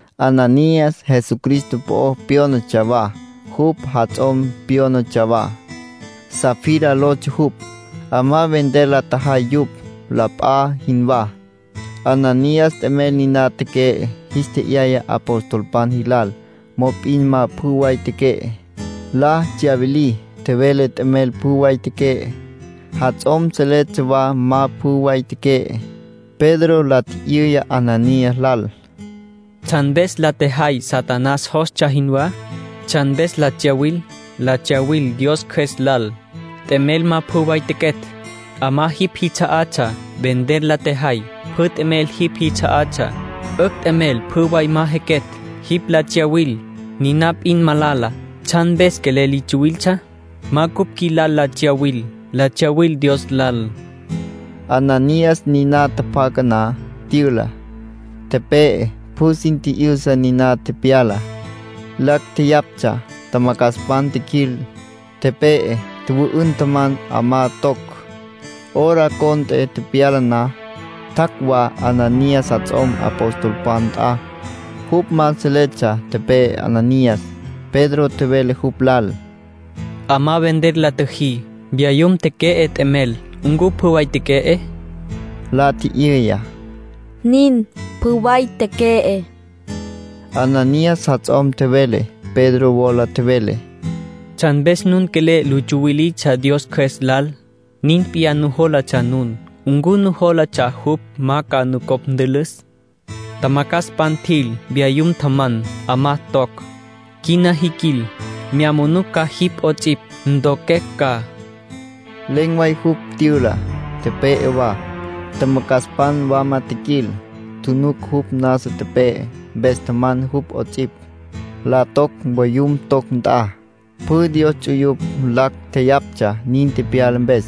Ananías Jesucristo po'o pyónatsja wa. Jupj jats'om pyónatsja wa. Safira lotsja jupj. 'Amá vender la tjajay yupj, la p'a jinwá. Ananías t'emel niná teque'e, jis tje'yaya apostolpan jilal. Mop'in ma pjü way teque'e. La tsyawilí. Tjevele t'emel pjü way teque'e. Jats'om seletsja wa ma pjü way teque'e. Pedro la tji'yüya Ananías lal: —¿Tsjan mpes la tjejay Satanás jostsja jinwá? ¿Tsjan mpes la tsyawil? La tsyawil Dios Cjües lal. T'emel ma pjü way tequetj. 'Amá jipj jits'a'atsja. Vender la tjejay. Pjü t'emel jipj jits'a'atsja. 'Ücj t'emel pjü way ma jequetj. Jipj la tsyawil, niná p'in malala. ¿Tsjan mpes quelel li tsuwiltsja? Ma cupj qjuilal la tsyawil. La tsyawil Dios lal —nin tjevele Pedro. Ananías niná tjapjaca na, tyüla, tepe'e. Pjü sin tji'yüsa ninana tepyalá. Lacj tjeyaptsja. Tjamacjaspan tjiquil, tepe'e tjüwü'ün, tjaman, 'amá toc. Hora cont'e tepyala na, tjac' wa Ananías jats'om apostolpan nt'a. Jupj ma seletsja tepe'e Ananías. Pedro tjevele jupj lal: —'Amá vender la tjüjí. Vyayum teque'e t'emel. ¿Ncu pjü way teque'e? —la tji'yüya. —Nin, pjü way teque'e —Ananías jats'om tjevele. Pedro wola tjevele: —¿Tsjan mpes nun quelel lu tsuwilitsja Dios Cjües lal? Nin p'iyá nujólatsja nun. ¿Ncu nujólatsja jupj ma ca nucopj ntülüs? Tjamacjaspan tjil, vyayum tjaman, 'amá toc. Quina jiquil. Mya manucj ca jipj 'ots'ipj, ntoquecj ca —nin tjevele Pedro. Len̈ way jupj tyüla, tepe'e wa. Tjamacjaspan wama tjiquil, tjunuc jupj nasa tepe'e. Mpes tjaman jupj 'ots'ipj, la toc voyum toc nt'a. Pjü Dios ts'uyupj lacj tjeyaptsja nin tepyala mpes.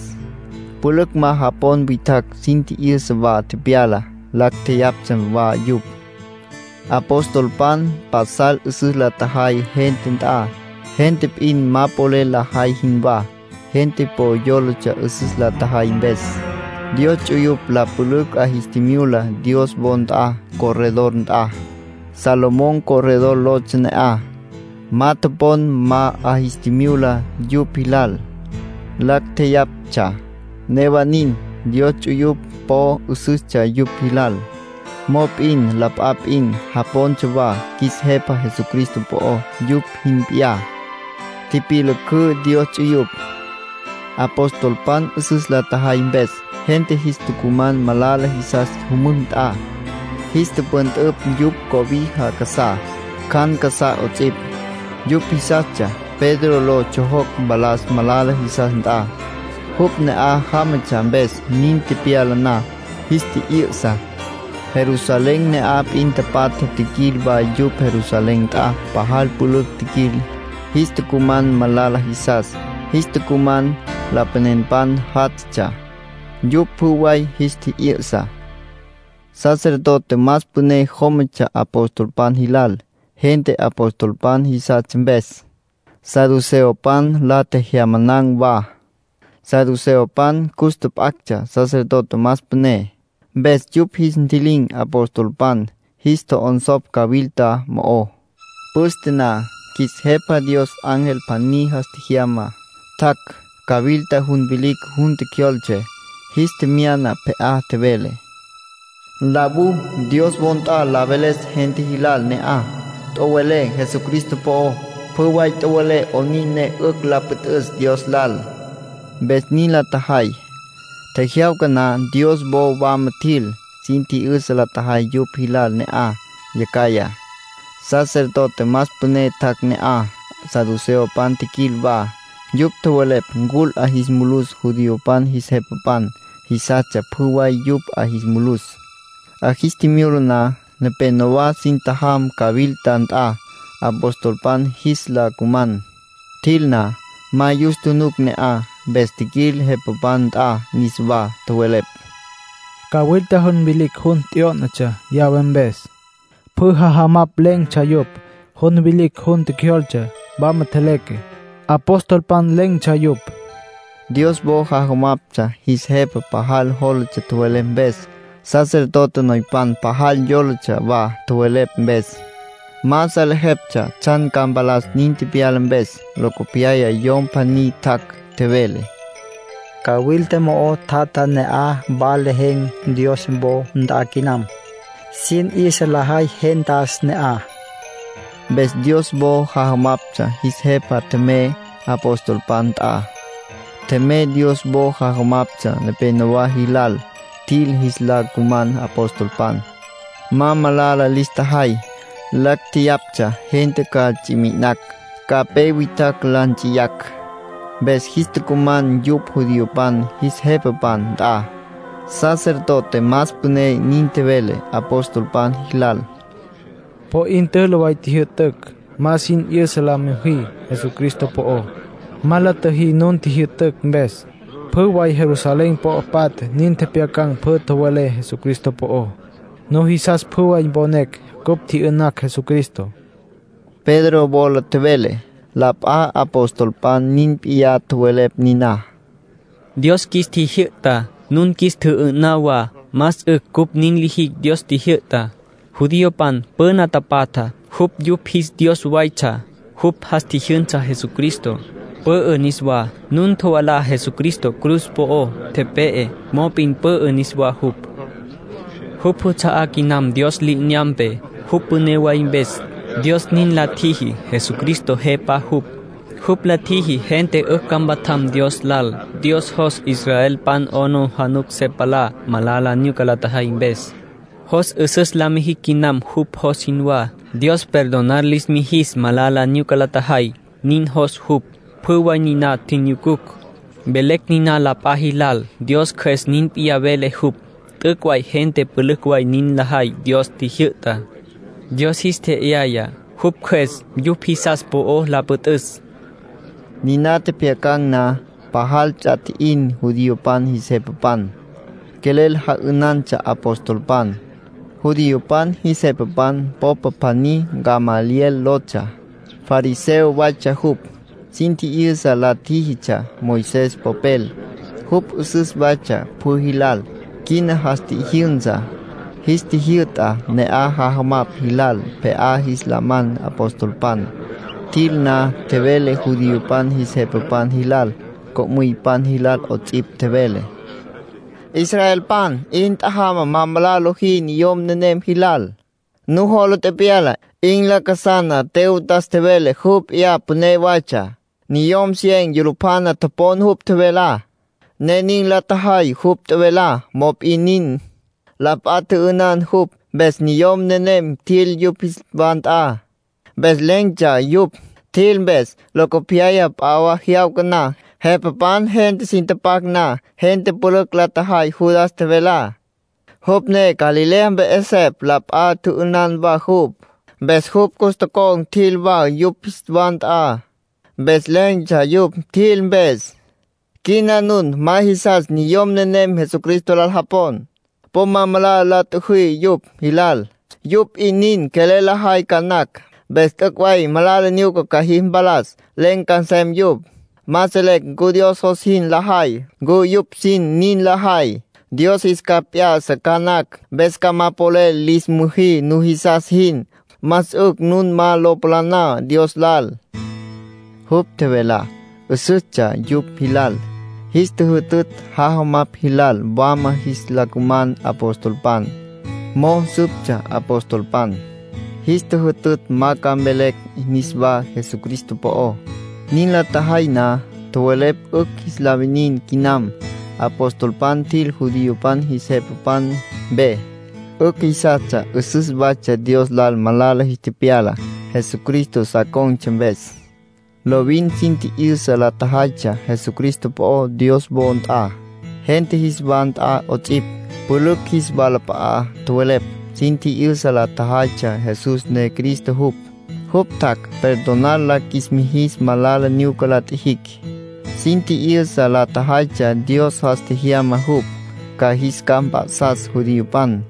Pülücj ma japon witjacj sin tji'yüsa wa tepyalá. Lacj tjeyaptsja wa yupj. Apostolpan pasal 'üsüs la tjajay gente nt'a, gente p'in ma polel lajay jinwá. Gente po yólatsja 'üsüs la tjajay mpes. Dios ts'uyupj la pülücj 'a jis tjimyula Dios wo nt'a, corredor nt'a. Salomón Corredor lotsja ne'aj. Ma topon ma 'a jis tjimyula yupj jilal. Lacj tjeyaptsja. Newa nin, Dios ts'uyupj po 'üsüstsja yupj jilal. Mop'in la p'a p'in japontsja wa qjuis Jepa Jesucristo po'ó, yupj jin p'iyá. Tipyülücǘ Dios ts'uyupj. Apostolpan 'üsüs la tjajay mpes, gente jis tucuman malala jisas jümücj nt'a. Jis tüpüntüpj yupj cobija casá, cjan casá 'ots'ipj. Yupj jisastsja Pedro lo tsjojoc mpalas malala jisas nt'a, jupj ne'aj jámatsja mpes. Nin tepyala na, jis tji'yü'sa. Jerusalén ne'aj p'in tapatja tjiquil wa yupj Jerusalén nt'a. Pajal pülücj tjiquil. Jis tucuman malala jisas. Jis tucuman lapanenpan jatatsja. Yupj pjü way jis tji'yü'sa. Sacerdote más püné jómatsja apostolpan jilal, gente apostolpan jisastsja mpes. Saduceopan la tjejyamanan̈ wa. (Saduceopan cus tjap'actsja sacerdote más püné.) Mpes yupj jis ntji'lin̈ apostolpan. Jis tjo'onsopj cawilta mo'ó. Püste na, qjuis Jepa Dios ángel pjaní jas tjejyama, tjac', cawilta jun vilicj jun tjecjyoltse. Jis tjemyana pje'á, tjevele: “Nlawú Dios wo nt'a la veles gente jilal ne'aj. Tjowelé Jesucristo po'ó, pjü way tjowelé 'onin ne 'ücj la püt'üs Dios lal”, ángel nin tjevele. Mpes nin la tjajay. Tjejyawca na Dios wo wama tjil, sin tji'yüsa la tjajay yupj jilal ne'aj. Yacjaya, sacerdote más püné tjac' ne'aj, saduceopan tjiquil wa; yupj tjowelepj ncul 'a jis mulus judiopan jis jepapan. Jisastsja pjü way yupj 'a jis mulus. 'A jis tjimyula na, nepenowá sin tjajam cawilta nt'a, apostolpan jis la cuman. Tjil na, ma yus tjunuc ne'aj. Mpes tjiquil jepapan nt'a niswá, tjowelepj: “Cawilta jun vilicj jun t'yó'natsja llave mpes. Pjü jajamapj lejen̈tsja yupj. Jun vilicj jun tjecjyoltsecj, wama tjeleque. Apostolpan len̈tsja yupj”, nin tjowelepj. Dios wo jajamaptsja jis jepa pajal jólatsja tjowelepj mpes. Sacerdote noypan pajal yólatsja wa tjowelepj mpes. Ma salejeptsja tsjan ca mpalas nin tepyala mpes. Locopyaya yom pjaní tjac', tjevele: “Cawilta mo'o tjatjá, ne'aj wa lejen̈ Dios wo nt'a quinam. Sin 'yüsa lajay gentas ne'aj”, nin tjevele. Mpes Dios wo jajamaptsja jis jepa tjemey apostolpan nt'a. Tjemey Dios wo jajamaptsja nepenowá jilal. Tjil jis la cuman apostolpan. Ma malala lis tjajay; lacj jeyaptsja gente ca ts'i mi'inacj, ca pe witjacj la nts'iyacj. Mpes jis tucuman yupj judiopan jis jepapan nt'a. Sacerdote más püné nin tjevele apostolpan jilal: —Po 'in tülü way tjijyü'tücj ma sin 'yüsa la müjí Jesucristo po'ó. Ma la tjüjí nu tjijyü'tücj mpes. Pjü way Jerusalén po'o patja nin tjepjyacan̈ pjü tjowelé Jesucristo po'ó. Nujisas pjü way mponecj cupj tji'yü'nacj Jesucristo —nin tjevele. Pedro wola tjevele. La p'a apostolpan nin p'iyá tjowelepj niná: —Dios qjuis tjijyü'ta, nun qjuis tjüjü'tǘ wa. Más 'ücj cupj nin lijicj Dios tjijyü'tá. Judiopan püna tapatja, jupj yupj jis Dios waytsja. Jupj jas tjijyünsa Jesucristo, pü'ü niswá. Nun tjovalá Jesucristo cruz po'ó, tepe'e, mop'in pü'ü niswá jupj. Jupj já'asa quinam Dios li'inyampe, jupj püné way mpes. Dios nin la tjiji. Jesucristo Jepa jupj. Jupj la tjiji gente 'ücj ca mpatjam Dios lal. Dios jos israelpan 'aplijila se palá malala nyuca la tjajay mpes. Jos 'üsüs la mijicj quinam jupj jos jinwá. Dios perdonar lis mijis malala nyuca la tjajay, nin jos jupj. Pjü way niná tjinyucucj, velecj niná la p'a jilal. Dios Cjües nin p'iyá vele jupj. T'üc' way gente pülücj way nin lajay Dios tjijyü'tá. Dios jis tje'yaya jupj Cjües yupj jisas po'ó la püt'üs —nin tjowelepj. Niná tjepjyacan̈ na, pajal ts'a tji'in judiopan jis jepapan. Quelel ja'ünantsja apostolpan. Judiopan jis jepapan popa pjaní Gamaliel lotsja. Fariseo waytsja jupj. Sin tji'yüsa la tjíjitsja Moisés popel. Jupj 'üsüs waytsja pjü jilal. Quina jas tjijyünsa, jis tjijyü'ta ne'aj jajamapj jilal pje'á jis la man apostolpan. Tjil na, tjevele judiopan jis jepapan jilal, co'müypan jilal 'ots'ipj. Tjevele: —Israelpan, 'in tjajamá ma malala lojí niyom nenem jilal. Nujola tepyala, 'in lacasana Teudas tjevele jupj p'iyá püné waytsja. Niyom cien yulupjana topon jupj tjevelá, ne nin la tjajay jupj tjevelá. Mop'in nin, la p'a tjü'ünan jupj. Mpes niyom nenem tjil yupj jis wa nt'a. Mpes len̈tsja yupj, tjil mpes. Locopyaya, p'a jyawca na, jepapan gente sin tapac na, gente pülücj la tjajay Judas tjevelá, jupj ne Galilea mpe 'esepj. La p'a tjü'ünan wa jupj. Mpes jupj cus tocon̈ tjil wa yupj jis wa nt'a. Mpes len̈tsja yupj, tjil mpes. Quina nun ma jisas niyom nenem Jesucristo lal japon. Po ma malala la tjüjí yupj jilal. Yupj p'in nin quelel lajay ca nacj. Mpes t'üc' way malala nyuca ca jis mpalas. Len̈ ca nsem yupj. Ma selecj ncu Dios jos jin lajay, ncu yupj sin nin lajay. Dios jis capj p'ya'sa ca nacj. Mpes ca ma polel lis müjí nujisas jin. Más 'ücj nun ma lo palaná Dios lal —Gamaliel nin tjevele. Jupj tjevelá 'üsüstsja yupj jilal. Jis tjüjütütj jajamapj jilal wama jis la cuman apostolpan. Mo'o süptsja apostolpan. Jis tjüjütütj ma ca mvelecj niswá Jesucristo po'ó. Nin la tjajay na, tjowelepj 'ücj jis la winin quinam. Apostolpan tjil judiopan jis jepapan mpe. 'Ücj jisastsja 'üsüs waytsja Dios lal malala jis tepyala, Jesucristo sa con̈tsja mpes. Lovin sin tji'yüsa la tjajaytsja Jesucristo po'ó Dios wo nt'a, gente jis wa nt'a 'ots'ipj. Pülücj jis walap'a'a tjowelepj. Sin tji'yüsa la tjajaytsja Jesús ne Cristo jupj. Jupj tjac' perdonar la qjuis mijis malala nyuca la tjijicj. Sin tji'yüsa la tjajaytsja Dios jas tjejyama jupj, ca jis capj mp'a'sas judiopan.